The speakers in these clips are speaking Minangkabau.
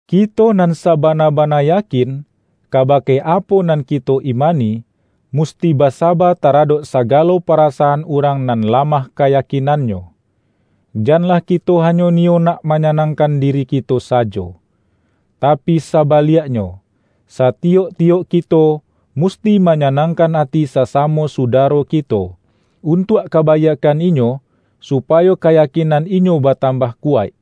Kito nan sabana-bana yakin, kabake apo nan kito imani, musti basaba taradok sagalo parasaan urang nan lamah kayakinannyo. Janlah kito hanyo niyo nak manyanangkan diri kito sajo. Tapi sabaliaknyo, satiyok-tiyok kito, musti manyanangkan ati sasamo sudaro kito, untuak kabaiakkan inyo, supayo kayakinan inyo batambah kuwaik.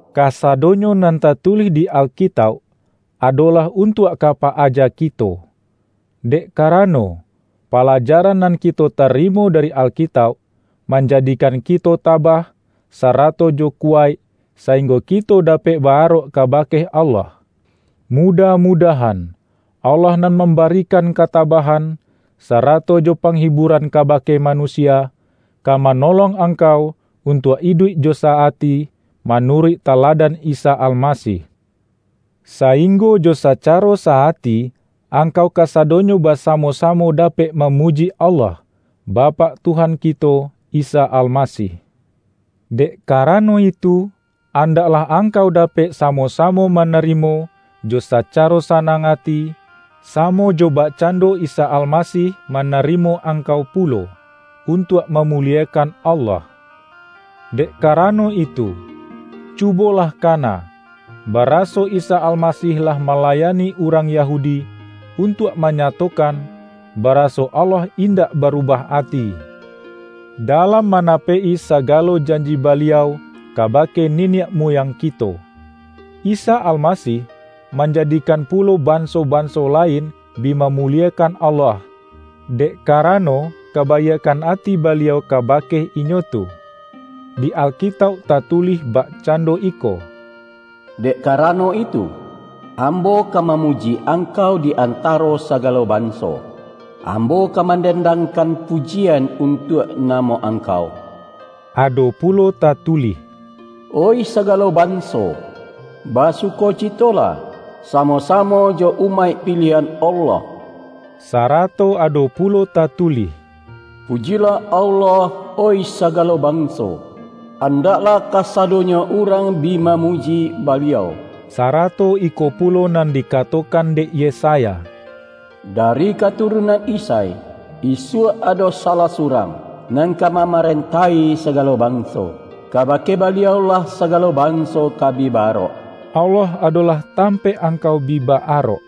Kasadonyo nan tatulih di Alkitauk, adolah untuak ka pa-aja kito. Dek karano, palajaran nan kito tarimo dari Alkitauk, manjadikan kito tabah, sarato jo kuwaik, sainggo kito dapek ba-arok kabake Allah. Mudah-mudahan, Allah nan mambarikan katabahan, sarato jo pangiburan kabake manusia, ka manolong angkau untuak iduik jo sa-ati, manuruik taladan Isa Almasih. Sainggo jo sacaro sa-ati, angkau kasadonyo basamo-samo dapek mamuji Allah, Bapak Tuhan kito Isa Almasih. Dek karano itu, andaklah angkau dapek samo-samo manarimo jo sacaro sanang ati, samo jo bakcando Isa Almasih manarimo angkau pulo, untuak mamuliekan Allah. Dek karano itu, cubolah kana, baraso Isa Almasih lah malayani urang Yahudi, untuak manyatokan baraso Allah indak barubah ati, dalam manapek-i sagalo janji Baliau kabake niniak muyang kito. Isa Almasih, manjadikan pulo banso-banso lain bi mamuliekan Allah, dek karano kabaiakkan ati Baliau kabake inyo tu. Di Alkitauk tatulih bakcando iko,”Dek karano itu, ambo ka mamuji Angkau di antaro sagalo banso, ambo ka mandendangkan pujian untuak namo Angkau.” Ado pulo tatulih,”Oih sagalo banso! Basukocitolah, samo-samo jo umaik piliahan Allah.” Sarato ado pulo tatulih,”Pujilah Allah, oih sagalo banso, andaklah kasadonyo urang bi mamuji Baliau!” Sarato iko pulo nan dikatokan dek Yesaya,”Dari katurunan Isai, isuak ado salah surang, nan ka mamarentahi sagalo banso; kabake Baliau-lah sagalo banso ka bi ba-arok.” Allah adolah tampaik angkau bi ba-arok.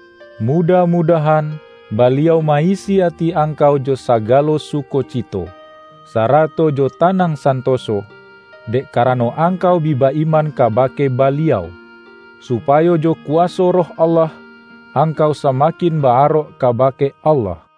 Mudah-mudahan Baliau ma-isi ati angkau jo sagalo sukocito, sarato jo tanang santoso, dek karano angkau bi ba-iman kabake Baliau, supayo jo kuwaso Roh Allah, angkau samakin ba-arok kabake Allah.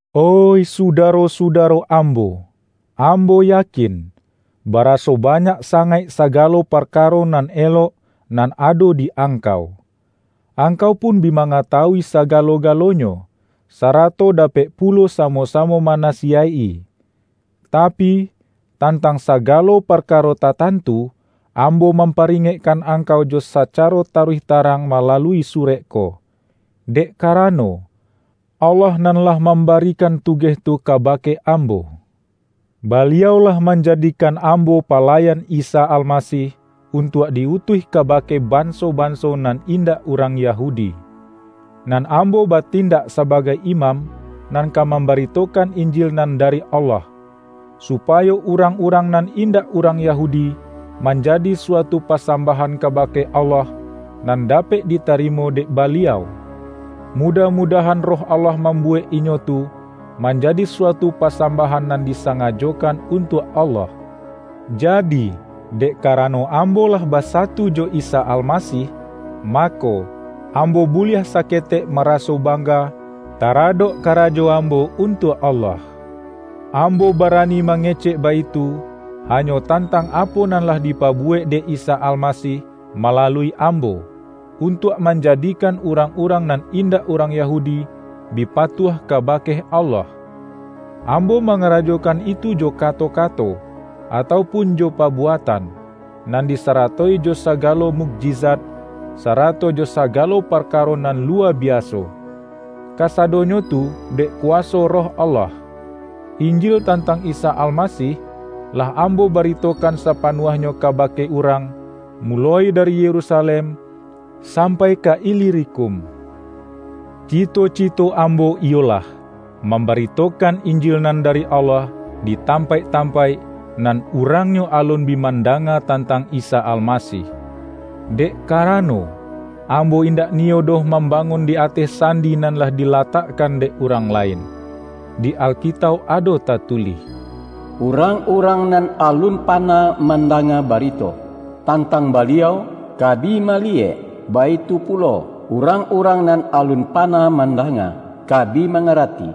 Oih sudaro-sudaro ambo! Ambo yakin, baraso banyak sangaik sagalo parkaro nan elok nan ado di angkau. Angkau pun bi mangatawui sagalo-galonyo, sarato dapek pulo samo-samo manasiyaik-i. Tapi, tantang sagalo parkaro tatantu, ambo mamparingekkan angkau jo sacaro taruih tarang malalui surek ko, dek karano, Allah nan lah mambarikan tugeh tu kabake ambo. Baliau lah manjadikan ambo palayan Isa Almasih, untuak di-utuih kabake banso-banso nan indak urang Yahudi. Nan ambo batindak sabagai imam, nan ka mambaritokan Injil nan dari Allah, supayo urang-urang nan indak urang Yahudi, manjadi suatu pasambahan kabake Allah, nan dapek ditarimo dek Baliau. Mudah-mudahan Roh Allah mambuwek inyo tu, manjadi suatu pasambahan nan disangajokan untuak Allah. Jadi, dek karano ambo lah basatu jo Isa Almasih, mako, ambo buliah saketek maraso bangga, taradok karajo ambo untuak Allah. Ambo barani mangecek baitu, hanyo tantang apo nan lah dipabuwek dek Isa Almasih malalui ambo, untuak manjadikan urang-urang nan indak urang Yahudi, bi patuah kabake Allah. Ambo mangarajokan itu jo kato-kato, atau pun jo pabuatan, nan disaratoi jo sagalo mukjizat, sarato jo sagalo parkaro nan luwa biaso; kasadonyo tu dek kuwaso Roh Allah. Injil tantang Isa Almasih, lah ambo baritokan sapanuahnyo kabake urang, muloi dari Yerusalem sampai ka Ilirikum. Cito-cito ambo iyolah, mambaritokan Injil nan dari Allah di tampaik-tampaik, nan urangnyo alun bi mandanga tantang Isa Almasih. Dek karano, ambo indak niyo doh mambangun di ateh sandi nan lah dilatakkan dek urang lain. Di Alkitauk ado tatulih,”Urang-urang nan alun panah mandanga barito tantang Baliau, ka bi maliyek; baitu pulo, urang-urang nan alun panah mandanga, ka bi mangarati.”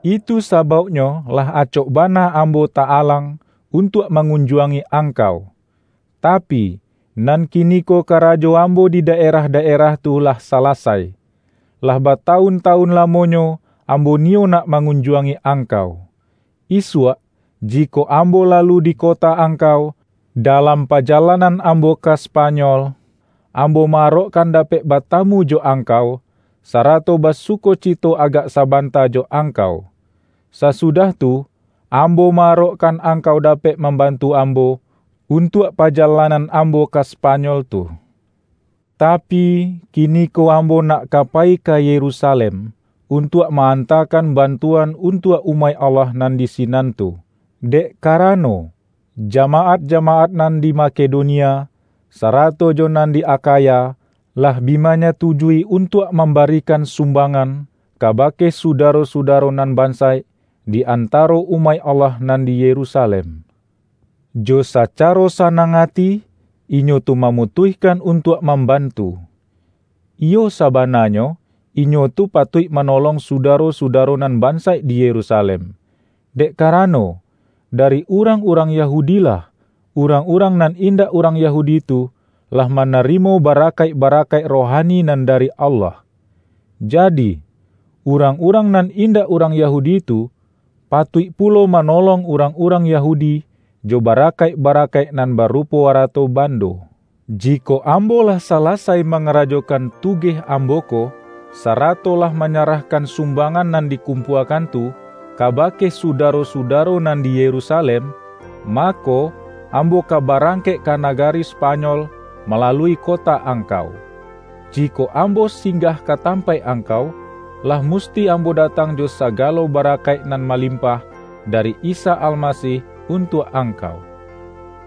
Itu sabauknyo lah acok bana ambo ta-alang, untuak mangunjuangi angkau. Tapi, nan kiniko karajo ambo di daerah-daerah tu, lah salasai. Lah batawun-tawun lamonyo, ambo niyo nak mangunjuangi angkau. Isuak, jikok ambo lalu di kota angkau, dalam pajalanan ambo ka Spanyol, ambo ma-arokkan dapek batamu jo angkau, sarato basukocito agak sabanta jo angkau. Sasudah tu, ambo ma-arokkan angkau dapek mambantu ambo, untuak pajalanan ambo ka Spanyol tu. Tapi, kiniko ambo nak ka payi ka Yerusalem, untuak ma-antakan bantuan untuak umaik Allah nan di sinan tu. Dek karano, jamaat-jamaat nan di Makedonia, sarato jo nan di Akhaya, lah bi manyatujui untuak mambarikan sumbangan, kabake sudaro-sudaro nan bansaik, di antaro umaik Allah nan di Yerusalem. Jo sacaro sanang ati, inyo tu mamutuihkan untuak mambantu. Iyo sabananyo, inyo tu patuik manolong sudaro-sudaro nan bansaik di Yerusalem; dek karano, dari urang-urang Yahudi-lah, urang-urang nan indak urang Yahudi tu, lah manarimo barakaik-barakaik rohani nan dari Allah. Jadi, urang-urang nan indak urang Yahudi tu, patuik pulo manolong urang-urang Yahudi, jo barakaik-barakaik nan barupo arato bando. Jikok ambo lah salasai mangarajokan tugeh ambo ko, sarato lah manyarahkan sumbangan nan dikumpuakan tu, kabake sudaro-sudaro nan di Yerusalem, mako, ambo ka barangkek ka nagari Spanyol, malalui kota angkau. Jikok ambo singgah ka tampaik angkau, lah musti ambo datang jo sagalo barakaik nan malimpah, dari Isa Almasih untuak angkau.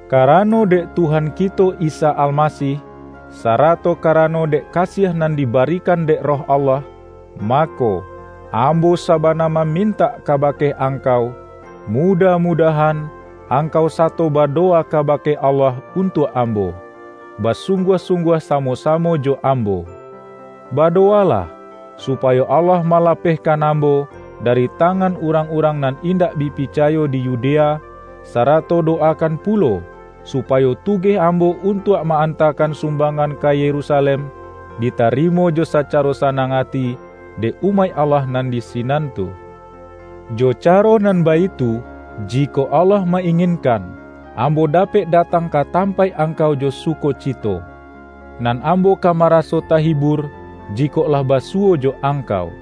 Karano dek Tuhan kito Isa Almasih, sarato karano dek kasiah nan dibarikan dek Roh Allah, mako, ambo sabana mamintak kabake angkau, mudah-mudahan, angkau sato badowa kabake Allah untuak ambo, basungguah-sungguah samo-samo jo ambo. Badowalah, supayo Allah malapehkan ambo dari tangan urang-urang nan indak bi picayo di Yudea, sarato dowakan pulo, supayo tugeh ambo untuak ma-antakan sumbangan ka Yerusalem, ditarimo jo sacaro sanang ati dek umaik Allah nan di sinan tu. Jo caro nan baitu, jikok Allah ma-inginkan, ambo dapek datang ka tampaik angkau jo sukocito. Nan ambo ka maraso tahibur, jikok lah basuwo jo angkau.